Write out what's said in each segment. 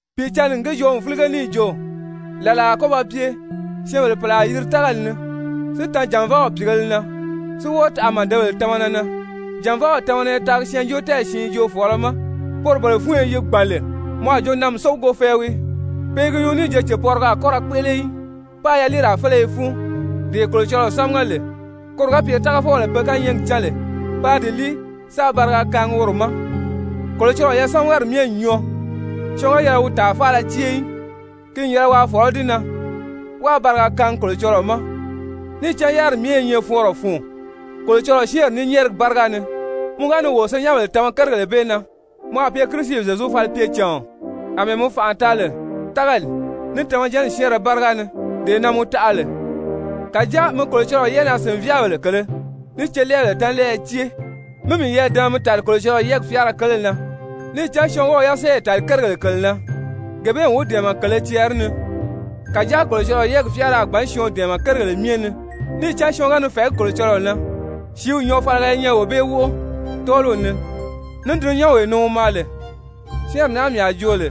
Pìicǎnni n gi joo n fílige níì jo: «Làlaa a kɔ́ ba pye syɛ́ɛnbèle pèle a yiri tágali ni si tan jànvaaw pìigēle na, si wɔ́ɔ taʔa màdebèle tamana na. Jànvaaw tamana i taagi syɛɛnjóotɛɛyi siin joofɔɔlɔ ma, poro bele fúnyo yi gbàn lè mɔ a jo namisógugo fɛɛ wii. Pe i gi nyuu níì jo cèpɔrigɔ a kɔ́ ra kpéʔele í, páā yaliiraa féleye fúun, dee Kolocɔlɔɔ sámaga lè koro ga pye tágafɔbèle pe kányɛɛgi cán lè, paa di líi sáā bariga kaangi woro ma. Kolocɔlɔɔ yasamagari myɛ n nyɔɔ, syɔɔn ga yɛlɛ wi tàa faala cée í, ki n yɛlɛ waa fɔ̀lɔ́ di na, wáā bariga kaangi Kolocɔlɔɔ ma. Níì cán yáriri myɛ i nyɛ fɔɔnrɔ fun, Kolocɔlɔɔ syɛ́ɛnri ní nyɛ́ɛrigi báriga ni.» Mɔ ga ni wo senyɛnbèle tama kérigèle bee na, mɔ a pye Kirisi Zyezu falipyecàɔn, àmɛɛ mɔ fànʔa taagi lè tágali, ní tamajanni syɛ́ɛnrɛ báriga ni, dee na mɔ taʔa lè. Kàjáa mi Kolocɔlɔɔ yɛ́ʔɛnaa-sìnvyaabèle kèlē ní celɛɛbèle tánlɛɛyɛ cée, mí miyɛɛ dama mi tàli Kolocɔlɔɔ yɛ́ɛgi fyáara kele na. Níì cán syɔɔn ga wi yasɛɛyi tàli kérigèle kèle na, gee bee n wi dɛ̀ɛmɛ kèlē cɛɛri ni, kàjáa Kolocɔlɔɔ yɛ́ɛgi fyáara a gbǎn syɔɔn dɛ̀ɛmɛ kérigèle myɛ ni, níì cán syɔɔn ga ni fɛ̀ɛgí Kolocɔlɔɔ na, sìíw nyɔɔfaliga i nyɛ wee bee wóʔo tɔ́ɔliw ni, ní dulunyanwee ni wi maa lè. Syɛ́ɛnri naa mii a joo lè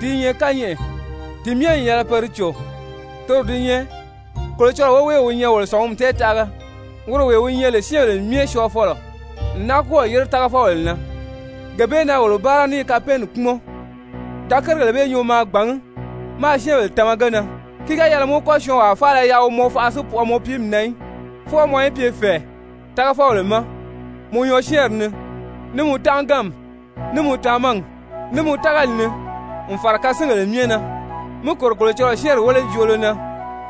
di i nyɛ kányɛʔɛ, ti myɛ n yɛlɛ pe di cò, toro di nyɛ: Kolocɔlɔɔ woweew wi nyɛ wolo sɔ̀ngumi tɛɛtaʔaga, woro wee wi nyɛ lè syɛ́ɛnbèle myɛ syɔɔfɔlɔ n náa kɔ́ɔ̀ yére tágafɔbèle na, gee bee na wolo báara ní i kapɛɛnni kpúmɔn. Da kérigèle bee nyuu maa gbàngí, máā syɛ́ɛnbèle tama ge na. Ki ga yɛlɛ mɔ í kɔ́ syɔɔnwaa faala yaʔa wi mɔ faʔa si pwɔɔ mɔ piimi na í. Fwɔɔ mɔ í pye fɛ̀ɛ tágafɔbèle ma mɔ nyɔɔsyɛɛnri ni, ní mɔ tánʔaganmi, ní mɔ tamagi, ní mɔ tágali ni n fàra kasingèle myɛ na. Mi kòro Kolocɔlɔɔ syɛ́ɛnri wélejoolo na,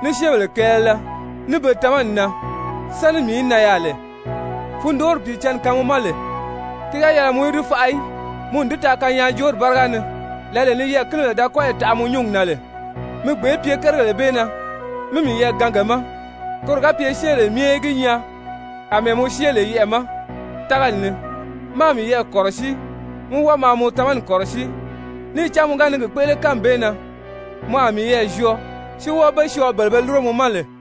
ní syɛ́ɛnbèle kɛɛlɛlɛ, ní be tamani na, sáni mii í nan yaà lè. Fundoori Pìicǎnni kaan mɔ ma lè, ki ga yɛlɛ mɔ í di faʔa í. Mɔ n di taa kanyaajoori báriga ni, lǎlee ni yɛɛ̀kinibèle da kɔ́yi taʔa mɔ nyúngi na lè. Mi gbèé pye kérigèle bee na, mi miyɛɛ gaan ge ma koro ga pye syɛ́ɛnbèle myɛ í gi nyaa àmɛɛ mɔ syée lè yɛʔɛ̀ ma tágali ni. Maa miyɛɛ kɔ̀rɔsíi, mí wɔ́ɔ maa mɔ tamani kɔ̀rɔsíi. Níì cán mɔ ga ni gi kpéʔele, kánmi bee na mɔ a miyɛɛ zyɔɔ, si wɔ́ɔ be syɔɔ, bele be lúro mɔ ma lè.